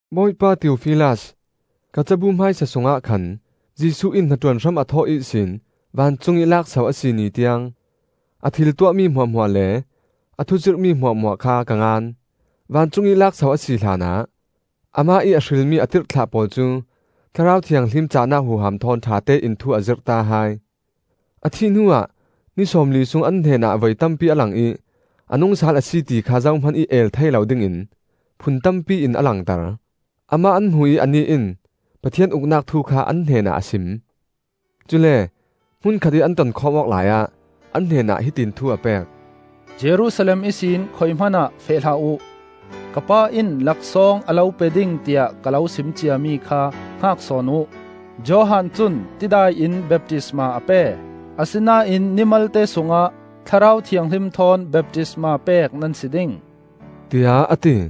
Bawipa Theofilas, Ka cabu hmaisa sungah khan Jesuh in hnaṭuan hram a thawh ihsin vancungih lakso a si ni tiang, a thil tuahmi hmuahhmuah le a thuzirhmi hmuahhmuah kha ka ngan. Vancung ih lakso a si hlanah Amah ih a hrilmi a tirhthlah pawl cu Thlarau Thianghlim cahnak huham thawn ṭhatein thu a zirhta hai. A thih hnuah ni sawmli sung an hnenah voi tampi a lang ih a nungsal a si ti kha zohmanih el thei lo dingin phun tampi in a langter. Amah an hmu ih anih in Pathian Uknak thu kha an hnenah a sim. Cule hmun khatih an tonkhawm awk laiah, an hnenah hiti in thu a pek: “Jerusalem ihsin khuihmanah feh hlah uh. Ka Pa in laksawng a lo pe ding tiah ka lo sim ciami kha hngak sawn uh. Johan cun tidai in baptisma a pe; asinain ni malte sungah Thlarau Thianghlim thawn baptisma pek nan si ding,” tiah a ti.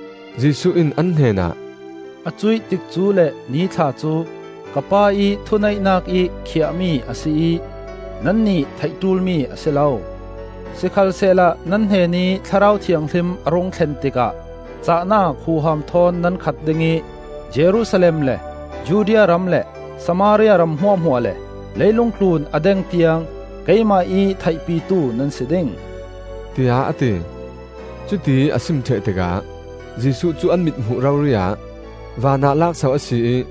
Jesuh in an hnenah, “A cuih tikcu le nithla cu ka Pa ih thuneihnak ih khiah-mi a si ih nannih theih ṭulmi a si lo. Sikhalsehla nan hnenih Thlarau Thianghlim a rung thlen tikah cahnak huham thawn nan khat ding ih Jerusalem le Judea ram le Samaria ram hmuahhmuah le leilung tlun a deng tiang keimah ih theihpitu nan si ding,” tiah a ti. Cutiih a sim ṭheh tikah Jesuh cu an mithmuh rori-ah vanah laakso a si ih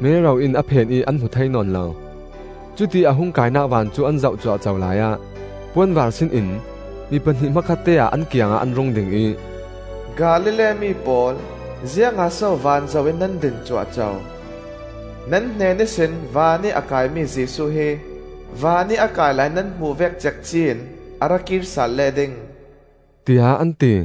mero in a phen ih an hmu thei nawn lo. Cutiih a hung kainak van cu an zoh cuahco laiah puanvaar sinin mi pahnih hmakhatte-ah an kiangah an rung ding ih, “Galilee mi pawl, ziangah so van zoh in nan din cuahco? Nan hnen ihsin vanih a kaimi Jesuh hi vanih a kai lai nan hmuh vek cekci in a rakir sal leh ding,” tiah an ti.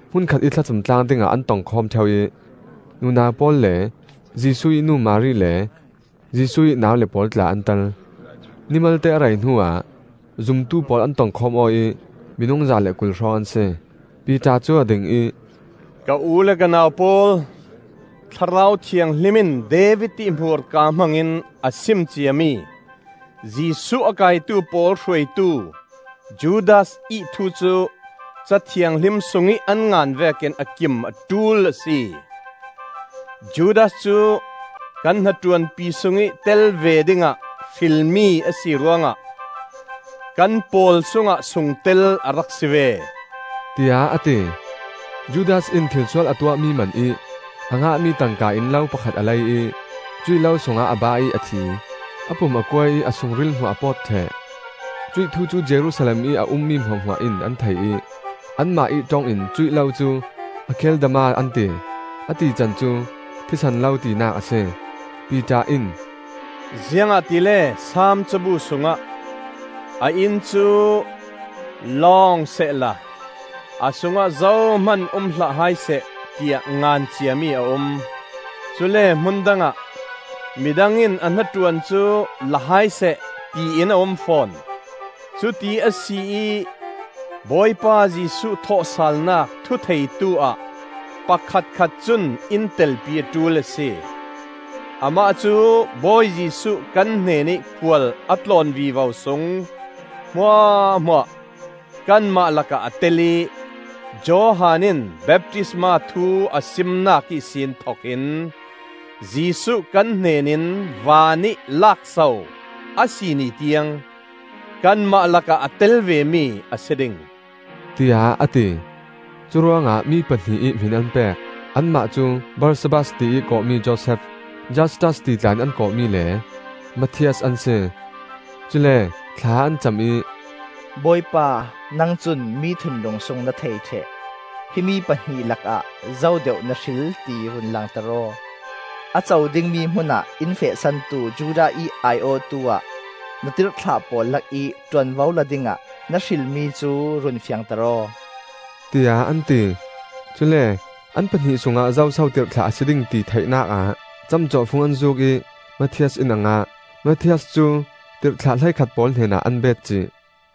Hmun khatih thlacam tlang dingah an tongkhawm ṭheu ih nunau pawl le Jesuh ih nu Mari le Jesuh ih naule pawl tla an tel. Ni malte a rei hnuah zumtu pawl an tongkhawm aw ih minung za le kul hrawng an si. Piter cu a ding ih, “Ka u le ka nau pawl, Thlarau Thianghlim in David ih hmurka hmangin a sim ciami Jesuh a kaitu pawl hruaitu Judas ih thu cu Ca Thianghlim sungih an ngan vekin a kim a ṭul a si. Judas cu kan hnaṭuanpi sungih tel ve dingah hrilmi a si ruangah kan pawl sungah sungtel a rak si ve,” tiah a ti. (Judas in thilsual a tuahmi manih a ngahmi tangka in lo pakhat a lei ih cuih lo sungah a bah ih a thi; a pum a kuai ih a sungril hmuah a pawt ṭheh. Cuih thu cu Jerusalem ih a ummi hmuahhmuah in an thei ih anmah ih ṭong in cuih lo cu Akeldama an ti; a tican cu, “Thisen Lo,” tinak a si.) Piter in, “Ziangah tile Saam cabu sungah, ‘A inn cu lawng sehla A sungah zohman um hlah hai seh,’ tiah ngan ciami a um. Cule hmun dangah, ‘Midang in a hnaṭuan cu la hai seh,’ tiin a um fawn. “Cuti a si ih Bawipa Jesuh thawhsalnak thutheitu-ah pakhatkhat cun in telpi a ṭul a si. Amah cu Bawi Jesuh kan hnenih khual a tlawn vivo sung hmuahhmuah kanmah lakah a tel ih, Johan in baptisma thu a simnak ihsin thokin Jesuh kan hnenin vanih laakso a si ni tiang, kanmah lakah a tel vemi a si ding,” tiah a ti. Curuangah mi pahnih ih hmin an pek. Anmah cu Barsabbas ti ih kawhmi Josef, (Justus ti tla in an kawhmi) le Matthias an si. Cule thla an cam ih, “Bawipa, nang cun mi thinlung sung na thei ṭheh; himi pahnih lakah zo deuh na hril ti run langter aw; a co dingmi hmunah in fehsantu Judas ih ai-awhtu ah na tirhthlah pawl lakih ṭuanvo la dingah na hrilmi cu run fiangter aw,” tiah an ti. Cule an pahnih sungah zoso tirhthlah a si ding ti theihnak ah camcawhfung an zuuk ih Matthias in a ngah. Matthias cu tirhthlah hleikhat pawl hnenah an betcih.